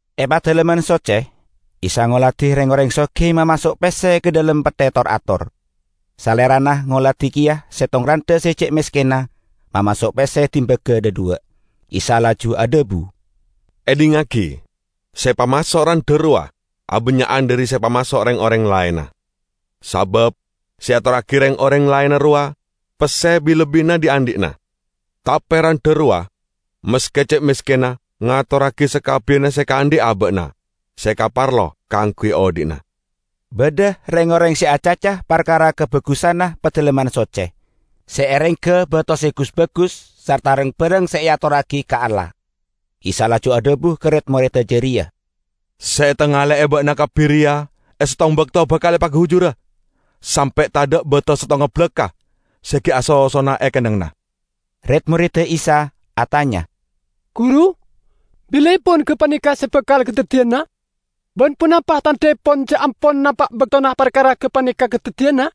E Padalemman Socce, Isa ngoladi reng-oreng sogi mamaso' pesse ka dhalem petthe tor-ator. Salerana ngoladi keya settong randha se ce' meskenna mamaso' pesse dimbaga dhadhuwa'. Isa laju adhabu, "Edhingngagi: se epamaso' randha rowa abannya'an dhari se epamaso' reng-oreng laenna. Sabab se eatorragi reng-oreng laenna rowa pesse bi-lebbina dhi'-andhi'na. Tape randha rowa, maske ce' meskenna, ngatorragi sakabbiyanna se ekaandhi' aba'na se ekaparlo kaangguy odhi'na." Badha reng-oreng se acaca parkara kabagusanna Padalemman Socce se erengga bato se gus-bagus sarta rang-barang se eatorragi ka Allah. Isa laju adhabu ka red-moredda jareya, "Se etangale'e ba'na kabbi reya e settong bakto bakal epagujura; sampe' tadha' bato settonga balakka' se gi' asosona e kennengnganna!" Red-moredda Isa atanya, "Guru, bilaepon gapaneka se bakal kadaddiyana? Ban ponapa tandhaepon ja' ampon napa' baktona parkara gapaneka kadaddiyana?"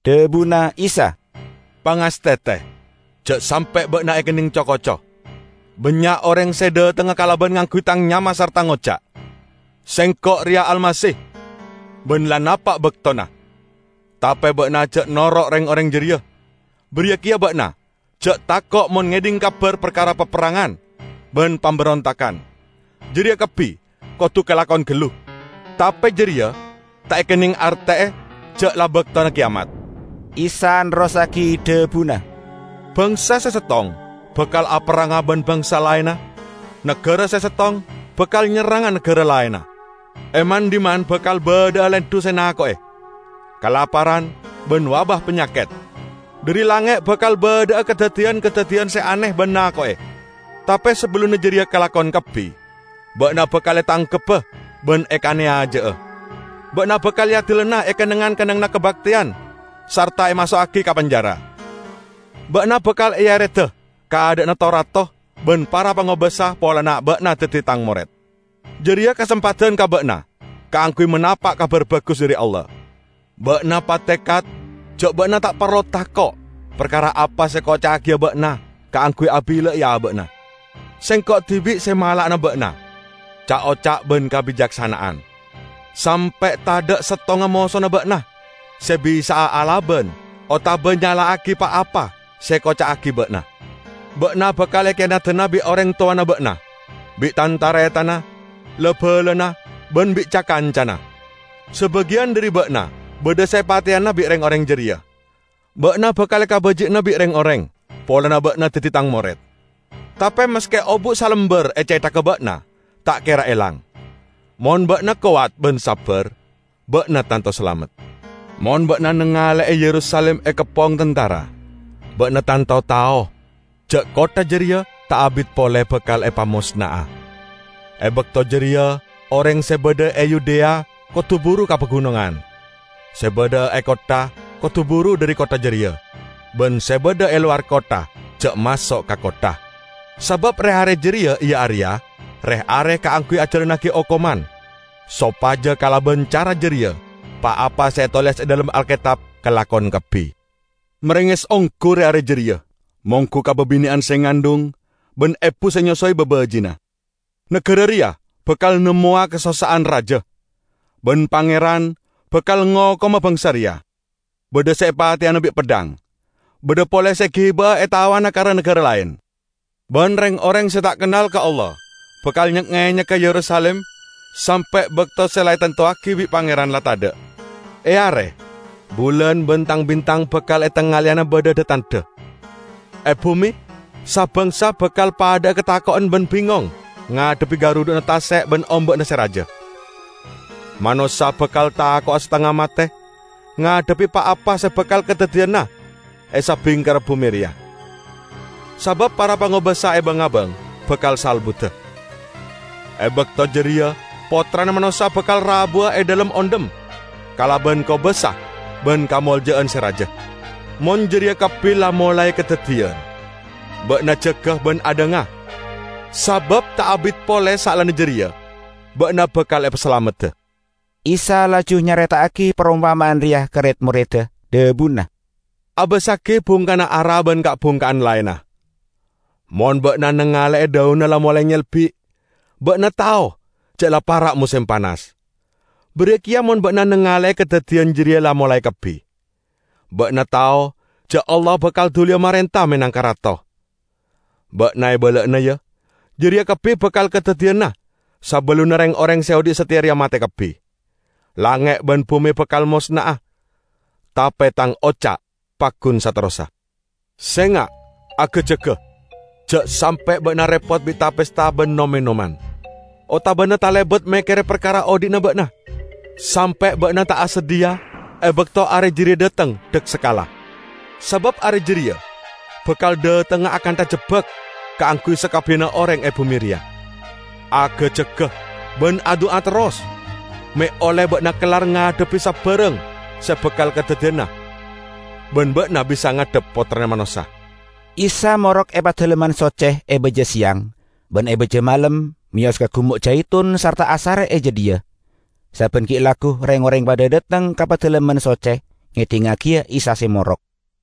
Dhabuna Isa, "Pangastete, ja' sampe' ba'na ekenneng co-koco. Bannya' oreng se dhatengnga kalaban ngangguy Tang nyama sarta ngoca', 'Sengko' reya Almasih!' ban 'La napa' baktona.' Tape ba'na ja' noro' reng-oreng jareya. Bariya keya ba'na ja' tako' mon ngedhing kabar parkara paperrangan ban pamberontagan. Jareya kabbi kodu kalakon gallu. Tape jareya ta' ekenneng arte'e ja' la baktona keyamat." Isa nerrossagi dhabuna, "Bangsa se settong bakal aperranga ban bangsa laenna; nagara se settong bakal nyerranga nagara laenna. E man-dhimman bakal badha'a lendhu se nako'e, kalaparan ban wabah panyaket. Dhari langnge' bakal badha'a kadaddiyan-kadaddiyan se ane ban nako'e. Tape sabellunna jareya kalakon kabbi, ba'na bakal etangkebba ban ekaneyaja'a. Ba'na bakal eadilana e kennengngan-kennengnganna kabakteyan sarta emaso'agi ka penjara. Ba'na bakal eereda ka adha'na to-rato ban para pangobasa polana ba'na daddi Tang mored. Jareya kasempadan ka ba'na kaangguy manapa' Kabar Bagus dhari Allah. Ba'na patekat ja' ba'na ta' parlo tako' parkara apa se ekoca'agiya ba'na kaangguy abillai aba'na. Sengko' dibi' se mala'ana ba'na ca'-oca' ban kabicaksana'an, sampe' tadha' settonga mosona ba'na se bisa'a alaban otaba nyala'agi pa-apa se ekoca'agi ba'na. Ba'na bakal ekiyanadana bi' oreng towana ba'na, bi' tan-taretanna, la-balana ban bi' ca-kancana; sabagiyan dhari ba'na badha se epateyana bi' reng-oreng jareya. Ba'na bakal ekabaji'ana bi' reng-oreng polana ba'na daddi Tang mored. Tape maske obu' salambar e cethagga ba'na ta' kera elang. Mon ba'na kowat ban sabbar, ba'na tanto salamet." "Mon ba'na nangale'e Yerusalim ekeppong tantara, ba'na tanto tao ja' kottha jareya ta' abit pole bakal epamosna'a. E bakto jareya oreng se badha e Yudea kodu buru ka pagunongan. Se badha e kottha kodu buru dhari kottha jareya, ban se badha e lowar kottha ja' maso' ka kottha. Sabab re-are jareya iya areya 'Re-are Kaangguy Ajalannagi Okoman,' sopaja kalaban cara jareya pa-apa se etoles e dhalem Alketab kalakon kabbi. Marenges onggu re-are jareya monggu ka babine'an se ngandhung ban ebu se nyosowe babaji'na! Nagara reya bakal nemmowa kasossa'an raja, ban Pangeran bakal ngokoma bangsa reya. Badha se epateyana bi' peddhang, badha pole se egiba'a etawana ka ra-nagara laen; ban reng-oreng se ta' kennal ka Allah bakal nyek-ngenyegga Yerusalim sampe' bakto se la etantowagi bi' Pangeran la tadha'." "E are, bulan ban tang-bintang bakal etangaleyana badha dha-tandha. E bume sa-bangsa bakal padha'a katako'en ban bingong ngadhebbi garudhu'na tase' ban omba'na se raja. Manossa bakal tako'a satengnga mate ngadhebbi pa-apa se bakal kadaddiyana e sabingkerra bume reya, sabab para pangobasa e bang-abang bakal salbuda. E bakto jareya Pottrana Manossa bakal rabuwa e dhalem ondhem kalaban kobasa ban kamolja'an se raja. Mon jareya kabbi la molae kadaddiyan, ba'na jaga ban adhanga, sabab ta' abit pole saellana jareya ba'na bakal epasalamedda." Isa laju nyareta'agi parompama'an reya ka red-moredda, dhabuna, "Abassagi bungkana ara ban ka'-bungka'an laenna. Mon ba'na nangale'e dhaunna la molae nyelbi', ba'na tao ja' la para' mosem panas. Bariya keya mon ba'na nangale'e kadaddiyan jareya la molae kabbi, ba'na tao ja' Allah bakal duliya marenta menangka Rato. Ba'na ebala'ana, ya! Jareya kabbi bakal kadaddiyana sabellunna reng-oreng se odhi' sateya reya mate kabbi. Langnge' ban bume bakal mosna'a, tape Tang oca' paggun saterrossa." "Senga', aga-jaga, ja' sampe' ba'na repot bi' ta-pesta ban nom-enoman, otabana talebat mekkere parkara odhi'na ba'na, sampe' ba'na ta' asadhiya e bakto are jareya dhateng daksakala. Sabab are jareya bakal dhatengnga akantha jebbak kaangguy sakabbiyanna oreng e bume reya. Aga-jaga, ban adu'a terros, me' olle ba'na kellar ngadhebbi sabarang se bakal kadaddiyana ban ba'na bisa ngadhep Pottrana Manossa." Isa morok e Padalemman Socce e baja seyang, ban e baja malem meyos ka Gumo' Jaitun sarta asare e jadhiya. Sabban gi' laggu reng-oreng padha dhateng ka Padalemman Socce ngedhingngagiya Isa se morok.